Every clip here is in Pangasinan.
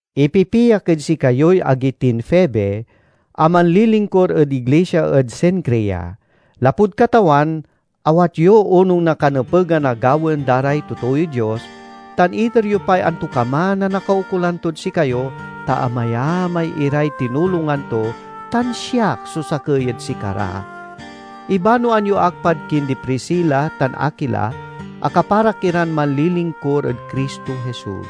Ipipiak ed sikayoy agi tin Febe, a manlilingkur ed iglisia ed Cencrea. Lapud Katawan, awat yo onung na kanepegan a gawaen da ray totooy Dios, tan iter yo pay antokaman a nakaukolan tod sikayo, ta amayamay iray tinulongan to, tan siak so sakey ed sikara. Ibanoan yo ak pad kindi Priscila tan Aquila a kaparak iran manlilingkur ed Cristo Jesus.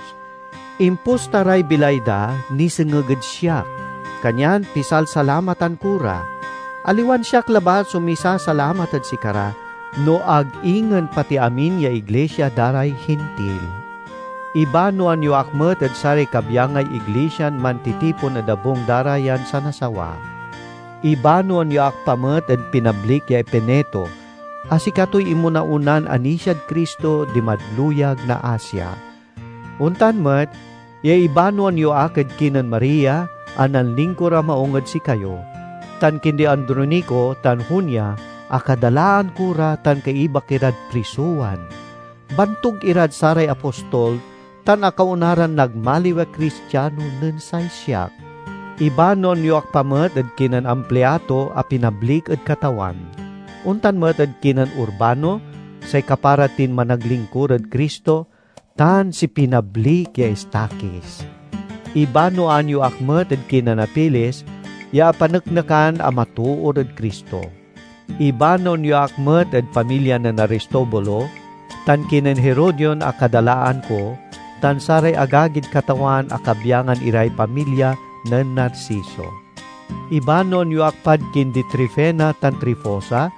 Imposta ray bilay da nisengeg ed siak, kanyan pisalsalamatan ko ra; aliwan siak labat so misasalamat ed sikara, no ag ingen pati amin ya iglisia da ray Hintil. Ibanoan yo ak met ed saray kabyangay iglisian mantitipon ed abung da ra yan sanasawa. Ibanoan yo ak pa met ed pinablik ya Epeneto, a sikatoy inmona-onan anisiad Cristo dimad luyag na Asia. Ontan met ya ibanoan yo ak ed kinen Maria a nanlingkur a maung ed sikayo, tan kindi Andronico tan Junia a kadalaan ko ra tan kaibak irad prisowan; bantug irad saray apostol tan akaona ran nagmaliw a Cristiano nen say siak. Ibanoan yo ak pa met ed kinen Ampliato a pinablik ed Katawan; ontan met ed kinen Urbano, say kapara tin managlingkur ed Cristo, tan si pinablik ya Estaquis. Ibanoan yo ak met ed kinen Apeles ya apaneknekan a matoor ed Cristo. Ibanoan yo ak met ed pamilya nen Aristobulo, tan kinen Herodion a kadalaan ko tan saray agagid Katawan a kabyangan iray pamilya nen Narciso. Ibanoan yo ak pad kindi Trifena tan Trifosa,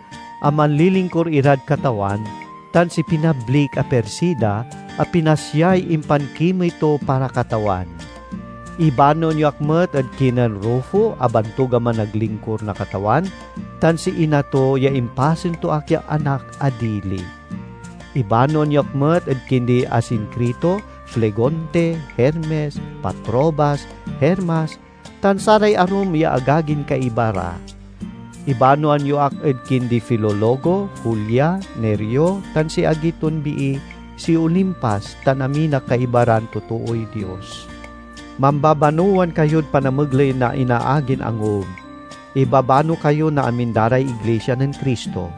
a manlilingkur irad Katawan, tan si pinablik a Persida, a pinasyay impankimey to para Katawan. Ibanoan yo ak met ed kinen Rufo a bantug a managlingkur na Katawan, tan si ina to ya impasen to ak ya anak a dili. Ibanoan yo ak met ed kindi Asincrito, Flegonte, Hermes, Patrobas, Hermas, tan saray arum ya agagin kaiba ra. Ibanoan yo ak ed kindi Filologo, Julia, Nereo tan si agi ton bii, si Olimpas tan amin a kaiba ran totooy Dios. Mambabanowan kayod panamegley na inaagin angub. Ibabano kayo na amin da ray iglisia nen Cristo.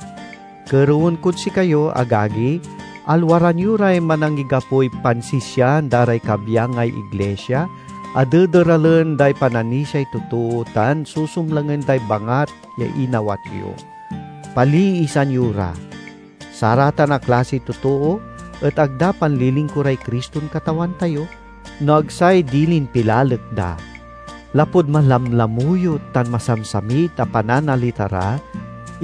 Kerewen kod sikayo, agagi, alwaran yo ray manangigapoy pansisian da ray kabyangay iglisia, a dederalen day pananisiay totoo tan susumlangen day bangat ya inawat yo. Paliisan yo ra. Saratan a klasiy totoo et ag da panlilingkuray Criston Katawan tayo, no ag say dilin pilalek da. Lapud malamlamuyot tan masamsamit a pananalita ra,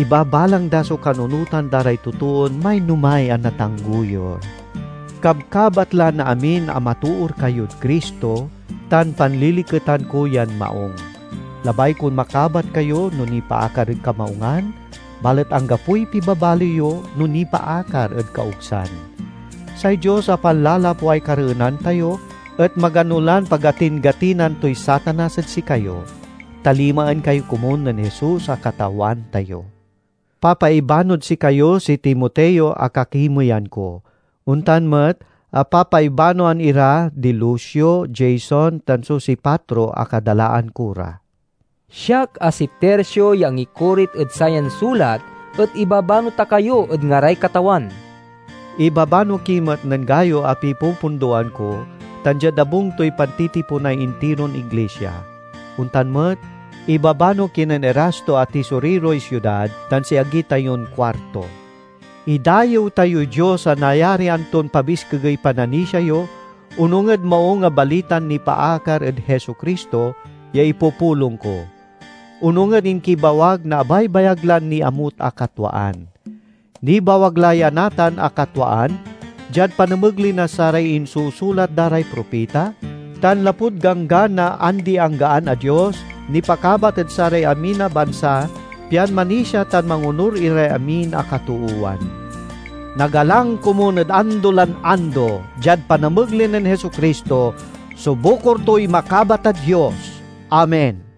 ibabalang da so kanunotan da ray totoon mainomay a natanggoyur. Kabkabat la na amin a matoor kayod Cristo, tan panliliketan ko yan maung. Labay kon makabat kayo no nipaakar ed kamaungan, balet anggapoy pibabali yo no nipaakar ed kaogsan. Say Dios a panlalapway kareenan tayo et magano lan pagatin-gatinan toy Satanas ed sikayo. Talimaen kayo komun nen Jesus a Katawan tayo. Papaibanoad sikayo si Timoteo a kakimeyan ko. Ontan met a papaibanoan ira di Lucio, Jason, tan Sosipatro, a kadalaan ko ra. Siak, a si Tercio, ya angikorit ed sayan sulat et ibabano ta kayo ed ngaray Katawan. Ibabano ki met nen Gayo a pipupundoan ko tan diad abung toy pantitiponay intiron iglisia. Ontan met, ibabano kinen Erasto a tisoriroy siudad tan si agi tayon Cuarto. Idayew tayoy Dios a nayarian ton pabiskegey pananisia yo, onung ed Maung a Balitan nipaakar ed Jesu-Cristo ya ipupulong ko; onung ed inkibawag na abaybayag lan niamut a katwaan. Nibawag la ya natan a katwaan diad panamegley na saray insusulat da ray propita; tan lapud ganggan na andi-anggaan a Dios, nipakabat ed saray amin a bansa pian manisia tan mangonur iray amin a katoowan. Nagalang komun ed ando lan ando, diad panamegley nen Jesu-Cristo, so bukor toy makabat a Dios! Amen.